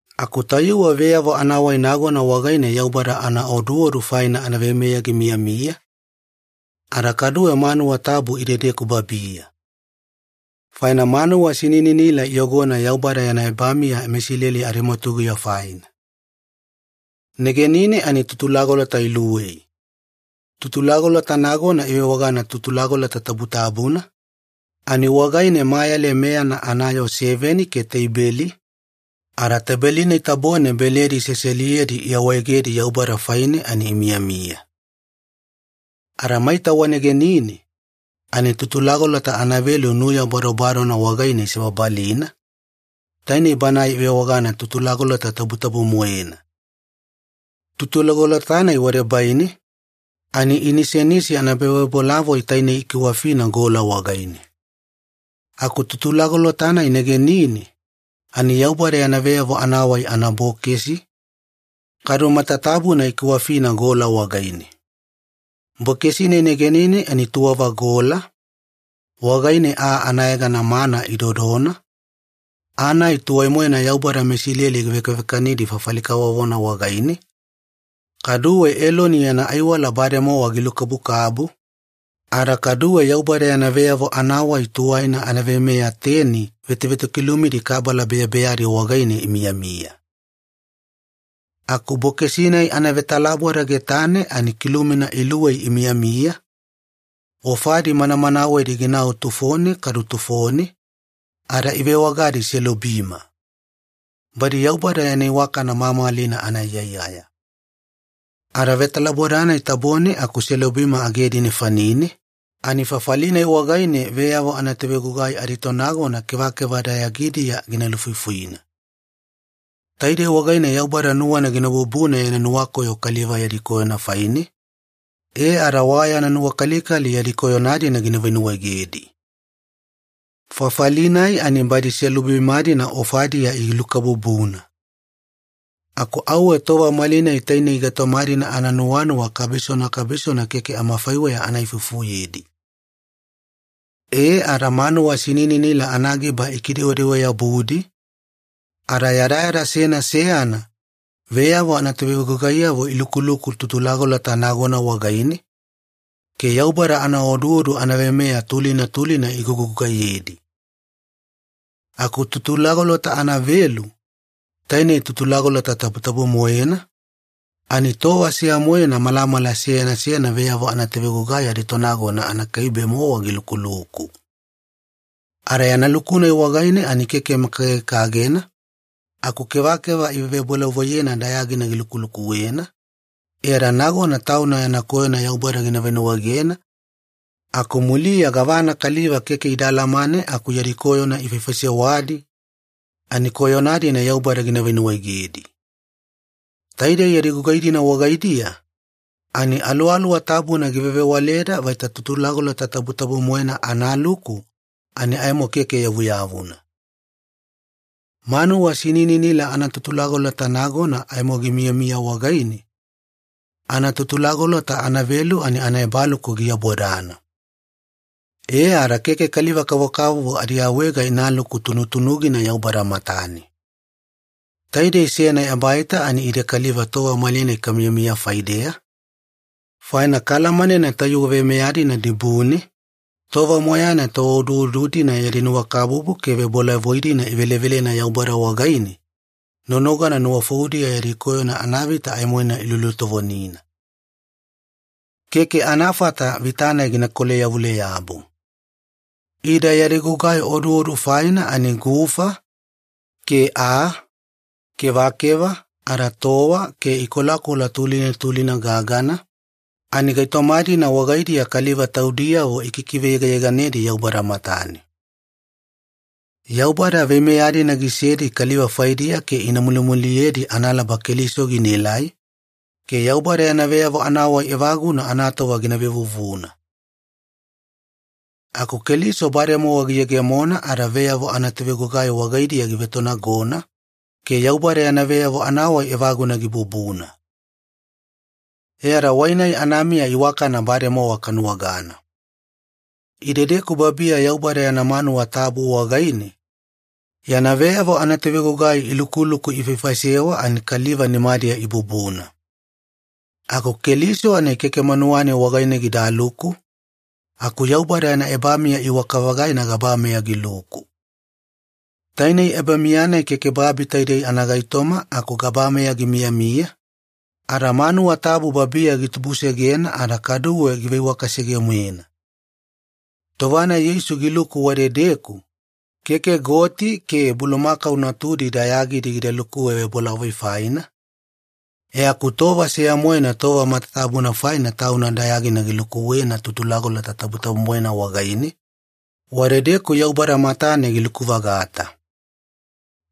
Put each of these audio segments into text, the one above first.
Aku tayuwe veyavo anawai nagona wagaine Yaubada anaoduodu faina anaveimeya gimiyamiya, ada kaduwe manuwa tabu idedeku babiya. Faina manuwa sinininila iyogona Yaubada yana ebamiya meIsileli adimwatuguya faina. Negenine ani tutulagolota iluwei. Tutulagolota nagona ivewagana ‘Tutulagolota Tabutabuna’, ani wagaine mayale meyana anayoo seveni ke teibeli, ada teibeli-nai tabone beledi seseliyedi iawaegedi Yaubada faine ani imiyamiya. Ada maita wanegenine, ani tutulagolota anavelu nuya badobadona wagaine isebabalina, tainei banae ivewagana ‘Tutulagolota Tabutabu-moena’. Tutulagolota-nai wadebaine, ani inisenisi anaebavebolavoi taine ikiwafina gola wagaine. Aku Tutulagolota-nai negenine, ani Yaubada yana veyavo anawai anabokesi, kadu matatabuna ikiwafina gola wagaine. Bokesi-nai negenine ani tuwava gola, wagaine aa anayegana ‘mana’ idodona, aa-nai tuwai-moena Yaubada meIsileli givekavekanidi fafali kavovona wagaine, kaduwe Eloni yana aiwala bademowa gilukabukabu, ada kaduwe Yaubada yana veyavo anawai tuwaina anaveimeya teni vetovetokilumidi kabala beyabeyadi wagaine imiyamiya. Aku bokesi-nai anavetalaboda getane ani kilumina iluwei imiyamiya, ofadi manamanawedi ginau tufone kadu tufone, ada ivewagadi ‘selubima’. Badi Yaubada yana iwakana mamalina anaiyaiyaya. Ada vetalaboda-nai tabone aku selubima agedi nefanine, ani fafali-nai wagaine veyavo anatovegugai aditonagona kevakeva dayagidiya gina lufuifuina. Taidei wagaine Yaubada nuwana gina bubuna yana nuwakoyo kaliva yadi koyona faine, e ada wa yana nuwakalikali yadi koyona-dina gina venuwaegedi. Fafali-nai ani badi selubima-dina ofadiya ilukabubuna. Aku auwe tova malinai tainei gaitoma-dina ananuwanuwa kabisona kabisona keke amafaiweya ana ifufuyedi. E ada manuwa sinininila anagiba ikidewedewe-yabudi, ada yadayada seyana seyana, veyavo anatovegugaiyavo ilukuluku tutulagolota nagona wagaine, ke Yaubada anaoduodu anaveimeya tulina tulina igugugaiyedi. Aku Tutulagolota anavelu, tainei Tutulagolota Tabutabu-moena, ani tova seya-moena malamala seyana seyana veyavo anatovegugai aditonagona anakaibe-mowa gilukuluku. Ada yana luku-nai wagaine ani keke makagekagena, aku kevakeva ivebolavoiyena dayagina gilukulukuwena, e ada nagona tauna yana koyona Yaubada gina venuwaegena, aku muliya gavana kaliva keke ida alamane aku yadi koyona ifaisewadi ani koyona-dina Yaubada gina venuwaegedi. Taidei yadi gugai-dina wagaidiya, ani Aluwaluwa Tabuna givevewaleda vaita Tutulagolota Tabutabu-moena analuku ani aimo keke yavuyavuna. Manuwa sinininila anatutulagolota nagona aimo gimiyamiya wagaine, anatutulagolota anavelu ani anaebaluku giabodana. E ada keke kaliva-kavokavovo adiawaega inaluku tunutunugina Yaubada matane. Taidei seyana ebaita ani ide kaliva tova malinai kamiyamiya faideya, faina kaalamanena tayuwe veimeya-nai dibune, tova moyaina tooduodu-dina yadi nuwakabubu ke vebolavoi-dina ivelevelena Yaubada wagaine, nonogana nuwafoudiya yadi koyona anavita aimoina ilulutovonina. Keke anafata vita-nai gina kolayavule-yabu. Ida yadi gugai oduodu faina ani gufa, ke aa, kevakeva, ada towa, ke ikolakola tulina tulina gagana, ani gaitoma-dina wagaidiya kaliva taudiyavo ikikiveyegayeganedi Yaubada matane. Yaubada veimeya-dina gisedi kaliva faidiya ke ina mulimuliyedi analaba Keliso ginaelai, ke Yaubada yana veyavo anawai evaguna anatova gina vevuvuna. Aku Keliso bademowa giyegemona ada veyavo anatovegugai wagaidiya givetonagona, ke Yaubada yana veyavo anawai evaguna gibubuna. E ada wai-nai anamiya iwakana bademowa kanuwagana. Idedeku babiya Yaubada yana manuwa tabu wagaine, yana veyavo anatovegugai ilukuluku ifaifaisewa ani kaliva nimadiya ibubuna. Aku Keliso ani keke manuwa-nai wagaine gidaluku, aku Yaubada yana ebamiya iwaka-vagaina gabameya giluku. Tainei ebamiya-nai keke babi taidei anagaitoma aku gabameya gimiyamiya, ada manuwa tabu babiya gitubusegena ada kaduwe giveiwakasege-moena. Tova-nai Yeisu giluku wadedeku, keke goti ke bulumakau natudi dayagidi gida lukuwe vebolavoi faina, e aku tova seya-moena tova matatabuna faina Tauna dayagina gilukuwena Tutulagolota Tabutabu-moena wagaine, wadedeku Yaubada matane giluku-vagata.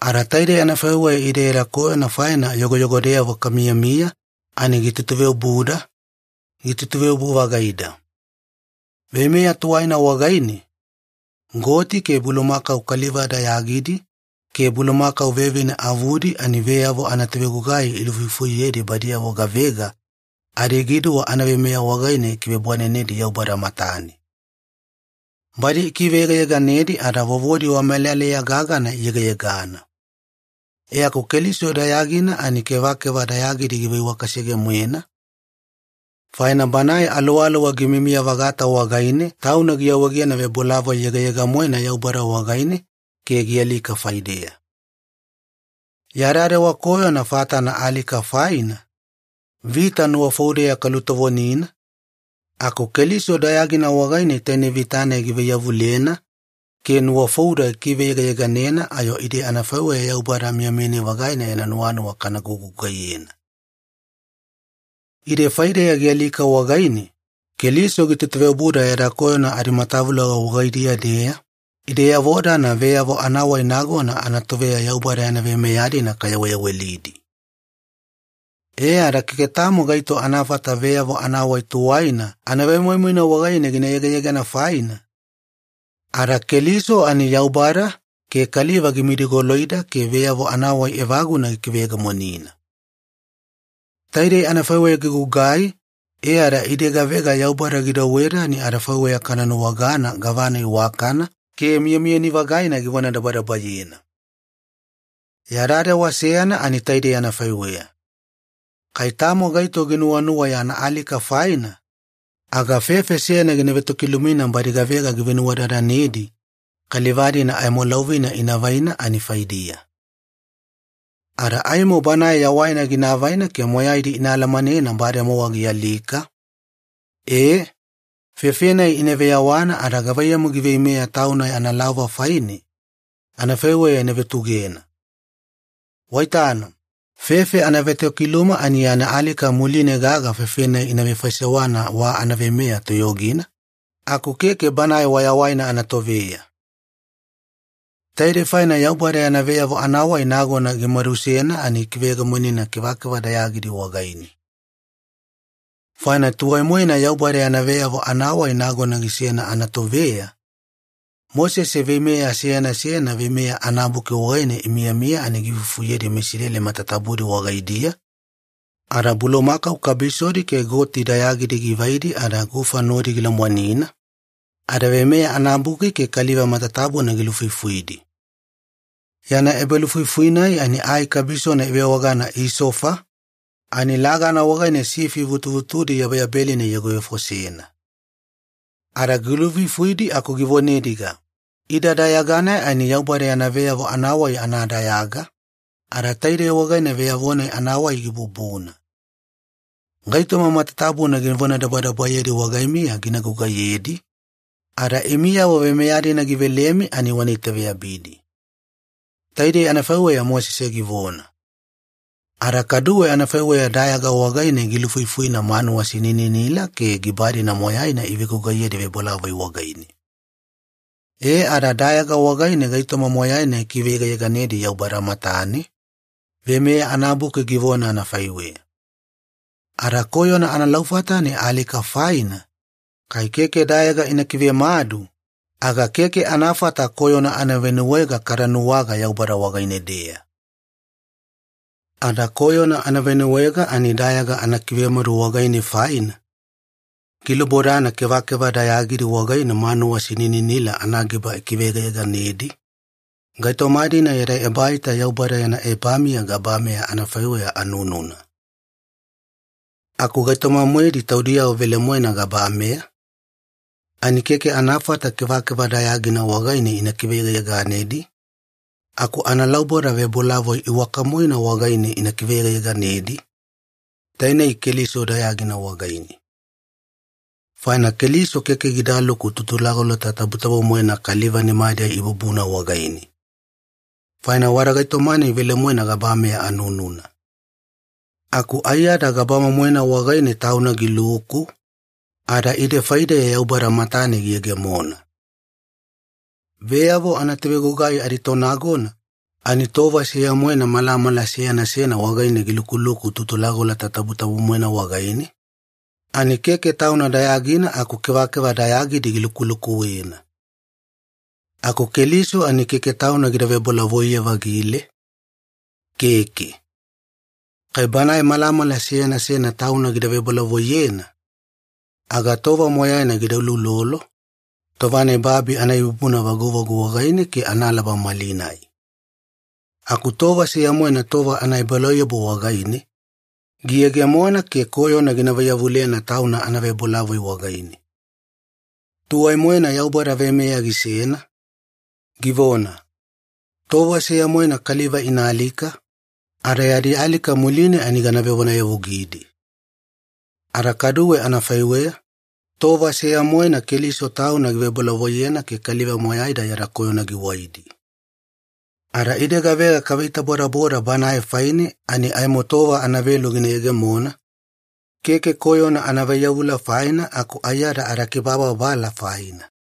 Ada taidei anafaiweya ide yada koyona faina yogoyogodeyavo kamiyamiya ani gitutuveobuda, gitutuveobu-vagaida. Veimeya tuwaina wagaine, goti ke bulumakau kaliva dayagidi ke bulumakau vevine avudi ani veyavo anatovegugai ilufuifuyedi badiyavo gavega adigiduwa anaveimeya wagaine gikivebwanenedi Yaubada matane. Badi ikiveyegayeganedi ada vovodi wamelaleya gagana iyegayegana. E aku Keliso dayagina ani kevakeva dayagidi giveiwaka sege-moena, faina Banae Aluwaluwa gimiyamiya-vagata wagaine Tauna giawaegena vebolavoi yegayega-moena Yaubada wagaine ke gialika faideya. Yada dewa koyona fatana alika faina, vita nuwafoudeya kalutovonina, aku Keliso dayagina wagaine tainei vita-nai givaiyavulena, ke nuwafouda gikiveyegayeganena ayo ide adafaiweya Yaubada miyamiyani-vagaina yana nuwanuwa kana gugugaiyena. Ide faideya gialika wagaine, Keliso gitutuveobuda yada koyona adimatavuloga wagaidiya-deya, ideyavo-dana veyavo anawai nagona anatoveya Yaubada yana veimeya-dina kayaweyawelidi. E ada keke tamo gaito anafata veyavo anawai tuwaina anavemoimoina wagaine gina yegayegana faina, ada Keliso ani Yaubada ke kaliva gimidigoloida ke veyavo anawai evaguna gikiveyegemonina. Taidei anafaiweya gigugai e ada ide gavega Yaubada gidouweda, ani adafaiweya kana nuwagana gavana iwakana ke miyamiyani-vagaina givonadabadabayena. Yada dewa seyana ani taidei anafaiweya. Kai tamo gaito ginuwanuwa yana alika faina, aga fefe seyana gina vetokilumina badi gavega givenuwadadanedi kaliva-dina aimo laovina ina vaina ani faidiya. Ada aimo banae yawaina gina avaina ke moyaidi ina alamanena bademowa gialika, e, fefe-nai ina veyawana ada gavaiyamu giveimeya tauna yana laova faine, anafaiweya ina vutugena. Waitana, fefe anatovetokiluma ani yana alika muline gaga fefe-nai ina vefaisewana wa anaveimeya toyogina, aku keke banae wayawaina anatoveya. Taidei faina Yaubada yana veyavo anawai nagona gimadusena ani gikiveyegemonina kevakeva dayagidi wagaine. Faina tuwai-moena Yaubada yana veyavo anawai nagona gisena anatoveya, Mosese veimeya seyana seyana Veimeya anabuki wagaine imiyamiya ani giifufuyedi meIsileli matatabudi wagaidiya, ada bulumakau kabisodi ke goti dayagidi givaidi ada gufa nodi gilomwanina, ada Veimeya anabuki ke kaliva matatabuna gilufuifuidi. Yana ebalufuifui-nai ani ai kabisona ivewagana ‘isofa’, ani lagana wagaine sifi vutuvutudi yabeyabelina iyogovefosena. Ada gilufuifuidi aku givonediga, “Ida dayaga-nai ani Yaubada yana veyavo anawai anadayaga, ada taidei wagaine veyavo-nai anawai gibubuna. Gaitoma matatabuna givonadabadabayedi wagaimiya gina gugaiyedi, ada imiyavo veimeya-dina givelemi ani wana itaveyabidi.” Taidei anafaiweya Mosese givona. Ada kaduwe anafaiweya dayaga wagaine gilufuifuina manuwa sinininila ke giba-dina moyaina ivegugaiyedi vebolavoi wagaine. E ada dayaga wagaine gaitoma moyaina ikiveyegayeganedi Yaubada matane, Veimeya anabuki givona anafaiweya. Ada koyona analaufata ani alika faina, kai keke dayaga ina kivemadu, aga keke anafata koyona anavenuwaega kada nuwaga Yaubada wagaine-deya. Ada koyona anavenuwaega ani dayaga anakivemadu wagaine faina, gilubodana kevakeva dayagidi wagaine manuwa sinininila anagiba ikiveyegayeganedi, gaitoma-dina yada ebaita Yaubada yana ebamiya gabameya anafaiweya anununa. Aku gaitoma-moedi taudiyavo velemoena gabameya ani keke anafata kevakeva dayagina wagaine ina kiveyegayeganedi, aku analauboda vebolavoi iwaka-moena wagaine ina kiveyegayeganedi, tainei Keliso dayagina wagaine. Faina Keliso keke gidaluku Tutulagolota Tabutabu-moena kaliva nimadiya ibubuna wagaine. Faina wada gaitoma-nai velemoena gabameya anununa. Aku aiyada gabama-moena wagaine Tauna giluku, ada ide faideya Yaubada matane giyegemona. Veyavo anatovegugai aditonagona ani tova seya-moena malamala seyana seyana wagaine gilukuluku Tutulagolota Tabutabu-moena wagaine, ani keke tauna dayagina aku kevakeva dayagidi gilukulukuwena. Aku Keliso ani keke Tauna gida vebolavoiye-vavagile, keke. Kai Banae malamala seyana seyana Tauna gida vevebolavoiyena, aga tova moyaina gida uloulolo, tova-nai babi anaibubuna vaguvagu wagaine ke analaba malinai. Aku tova seya-moena tova anaebalauyabu wagaine, giyegemona ke koyona gina vaiyavulena Tauna anavebolavoi wagaine. Tuwai-moena Yaubada veimeya gisena, givona, “Tova seya-moena kaliva ina alika, ada yadi alika muline ani gana vevonayavugidi.” Ada kaduwe anafaiweya, tova seya-moena Keliso Tauna givebolavoiyena ke kaliva moyaida yada koyona giwaidi. Ada ide gavega kaveitabodaboda Banae faine ani aimo tova anavelu gina yegemona, keke koyona anavaiyavula faina aku aiyada adakibababala faina.